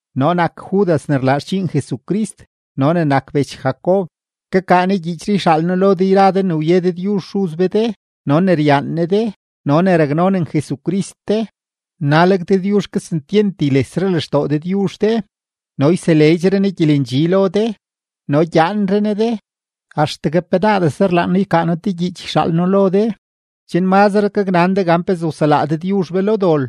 Noo nak Judas ne rlaa xdxiin Jesucrist no ne nak bech Jacob. Kakaa noo gyiichree yxaal noo lo de yra de ne wye Dëdyuzh Xuz be de no ne ryaan Ne de no ne raknonen Jesucrist de. Naleg Dëdyuzh kesentyent ylesre lextoo Dëdyuzh de no yseleedxre Ne gyelendxi lo de no gyaanre Ne de. Axtegue penaadese rlaan noo ykaa noo te gyiich yxaal noo lo de, chen mazre gaknan de gan pezee wselaa Dëdyuzh be lo dol.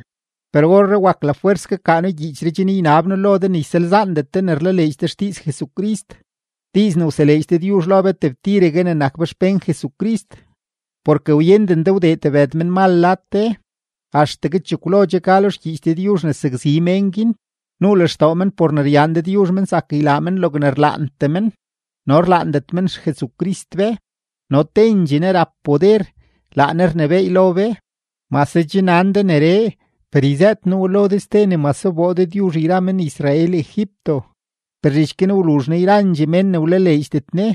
Per orree wak lafwers kakaa noo gyiichree chen ynab noo lo de ne ysalzaandet de ne rlaleedx de xdiiz Jesucrist, diiz ne wseleedx Dëdyuzh lo be tebtiregue ne nak be xpén Jesucrist. Porke wyenden de wdee tebëd menmal lad de, axtegue chekwlo che ka lo xgyiich Dëdyuzh ne sakzi mén guin; nuu lextoo men por ne ryaan Dëdyuzh men zak ylaa men logne rlaantee men no rlaandet men XJesucrist be, no tendxee Ne rap poder, laa Ne rnebééy lo be. Mase che nan de neree, per yzëët noo we lo de ste ne mase wboo Dëdyuzh yra men-Israel Egipto, per zhich guin wluzh Ne yrandxee mén ne wlaleedxdet Ne.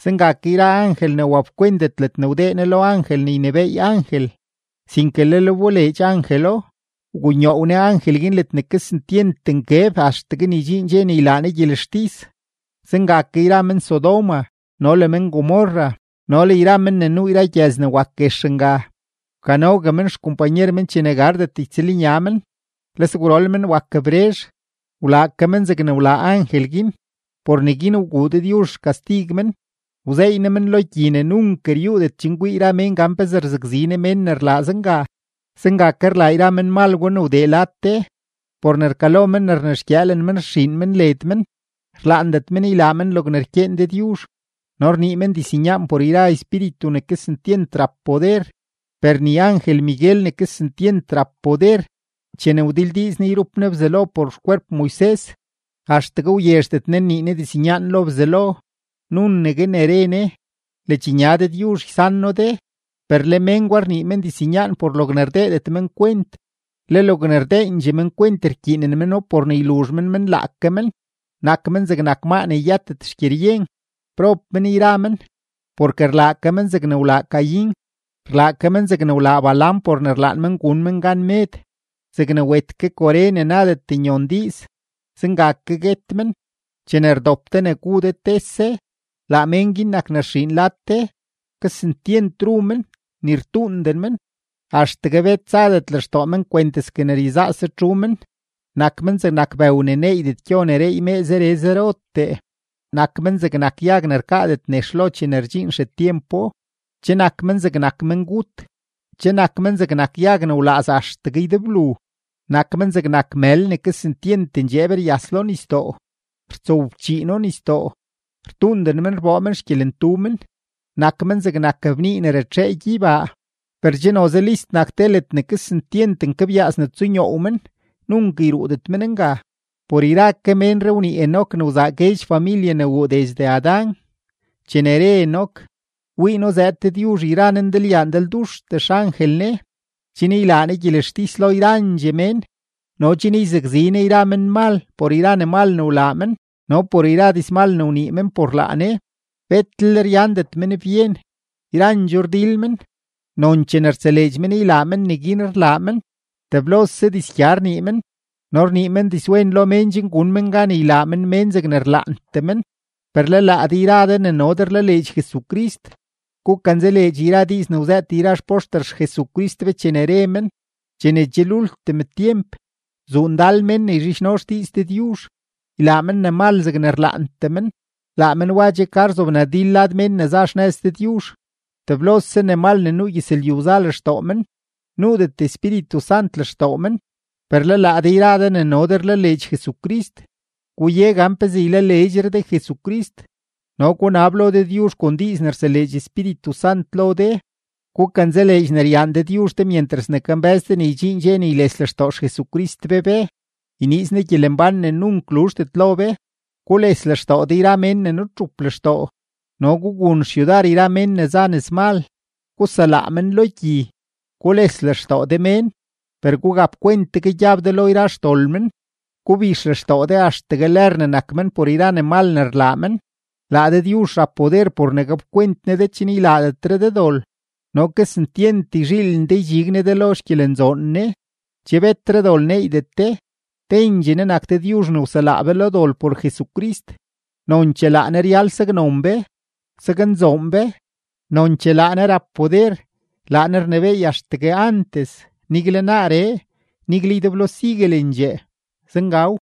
Zenga ke yra angel ne wapkwentet ledne wdee Ne lo angel ne ynebééy angel, sinke lel wboleedx angelo, wgunyoow Ne angel guin ledne kesentyent nkeb axtegue ne ydxiin dxe ne ylaa Ne gyelextis. Zenga ke yra men-Sodoma no le men-Gomorra no le yra men ne nuu gyëz ne wak guex nga, wkanogue men xkompanyer men chene gardet ytsëlnya men, le sgwrol men wak brezh. Wlaa ke men zegne wlaa angel guin. Por neguin wguu Dëdyuzh xkastig men, wzeey Ne men lo gyi ne nunk ryuudet chen kwii yra mén gan pezee rzakzi Ne mén ne rlaa zenga. Zenga ke rlaa yra menmal gwa ne wdee lad de; por ne rkalo men ne rnexgyëëlen men rxiin men led men, rlaandet men ylaa men logne rkyeen Dëdyuzh, no rnii men diznyaan por yra espíritu ne kesentyent rap poder. Per ni angel-Miguel ne kesentyent rap poder, chene wdildiiz ne yrup ne Bzelo por xkwerp Moises, axtegue wyezhdet ne nnii ne diznyaan lo Bzelo, nunegue ne re ne: “¡Ledxnya Dëdyuzh ysan noo de!” Per le mén gwa rnii men diznyaan por logne rdeedet men kwent, le logne rdeendxee men kwent rkyiinen meno por ne yluzh men men laake men, nak men zegnak maa ne yëtet xgyeryen. ¡Prob men yra men! Porke rlaa ke men zegne wlaa Caín, rlaa ke men zegne wlaa Balaam por ne rlaan men gun men gan med. Zegne wet ke Coré ne nadet nyon diiz, zenga ke guet men. Chene rdop de ne gu de tese, laa mén guin nak ne rxiin lad de; kesentyent ru men, ni rtuunden men, axtegue bet zadet lextoo men kwenteske ne ryezaase txu men. Nak men zegnak bëw ne neeydet gyo ne reey mee zere zerotee; nak men zegnak yag ne rkaadet nex lo chene rdxiin xetyempo; che nak men zegnak mengut; che nak men zegnak yag ne wlaaz axtegue ydeblu; nak men zegnak mël ne kesentyent ndxeeb ryas lo nisdoo, rtsowfchiino nisdoo, rtuunden men rboo men xgyelentu men; nak men zegnak bnii ne ratxee gyeybaa. Per che noze list nak te ledne kesentyent nkebyaas ne tsunyoow men, nunk yruudet men nga. Por yra ke ménree wnii Enoc ne wzaa guedx familye ne wuu desde Adán, chene re Enoc: “Wii noo zëëd Dëdyuzh yra Ne ndalyaa ndalduxtee xangel Ne, chen ylaa Ne gyelextis lo yrandxee mén no chen yzakzi Ne yra menmal por yra ne mal ne wlaa men no por yra dizmal ne wnii men por laa Ne.” Betlel ryandet men byen, yrandxoo rdil men, nonchee ne rtseleedx men ylaa men neguin rlaa men. Teblose dizgya rnii men no rnii men dizwen lo mén chen gun men gan ylaa men mén zegne rlaantee men. Per le laa de yra de ne no de rlaleedx Jesucrist, gukanzaleedx yra diiz ne wzëët yra xpoxter XJesucrist be chene re men: “Chene che lultim tyemp, zuu ndal mén ne yzhidxno xdiiz Dëdyuzh, ylaa men ne mal zegne rlaantee men.” Laa men wa che ka rzobnadil lad mén ne za xnëz Dëdyuzh, teblose ne mal ne nuu gyëzlyu za lextoo men, nuudet Espíritu Sant lextoo men. Per le laa de yra de ne no de rlaleedx Jesucrist, guye gan pezee ylaleedxre de Jesucrist no gunab lo Dëdyuzh kon diiz ne rseleedx Espíritu Sant lo de. Gukanzaleedx ne ryaan Dëdyuzh de myentras ne kambë́z de ne ydxiin dxe ne yles lextoo XJesucrist be be, yniiz Ne gyelembán ne nunk luzhdet lo be. Gules lextoo de yra mén ne nutxup lextoo. No gugun xyudar yra mén ne za nëzmal; guselaa men lo gyi. Gules lextoo de mén, per gugap kwent tegue gyab de lo yra xdol men; gubix lextoo de axtegue lër ne nak men por yra ne mal ne rlaa men. Laa Dëdyuzh rap poder por ne gapkwent Ne de chen ylaadetre de dol, no kesentyent yzhiilen de ydxig Ne de lo xgyelenzoon Ne, che betre dol neeydet de. Tendxee Ne nak Dëdyuzh ne wselaa be lo dol por Jesucrist, nonchee laa Ne ryal saknon be, saknzoon be, nonchee laa Ne rap poder, laa Ne rnebééy axtegue antes, nigle naaree, nigle ydeblo siguelendxee. Zengaw.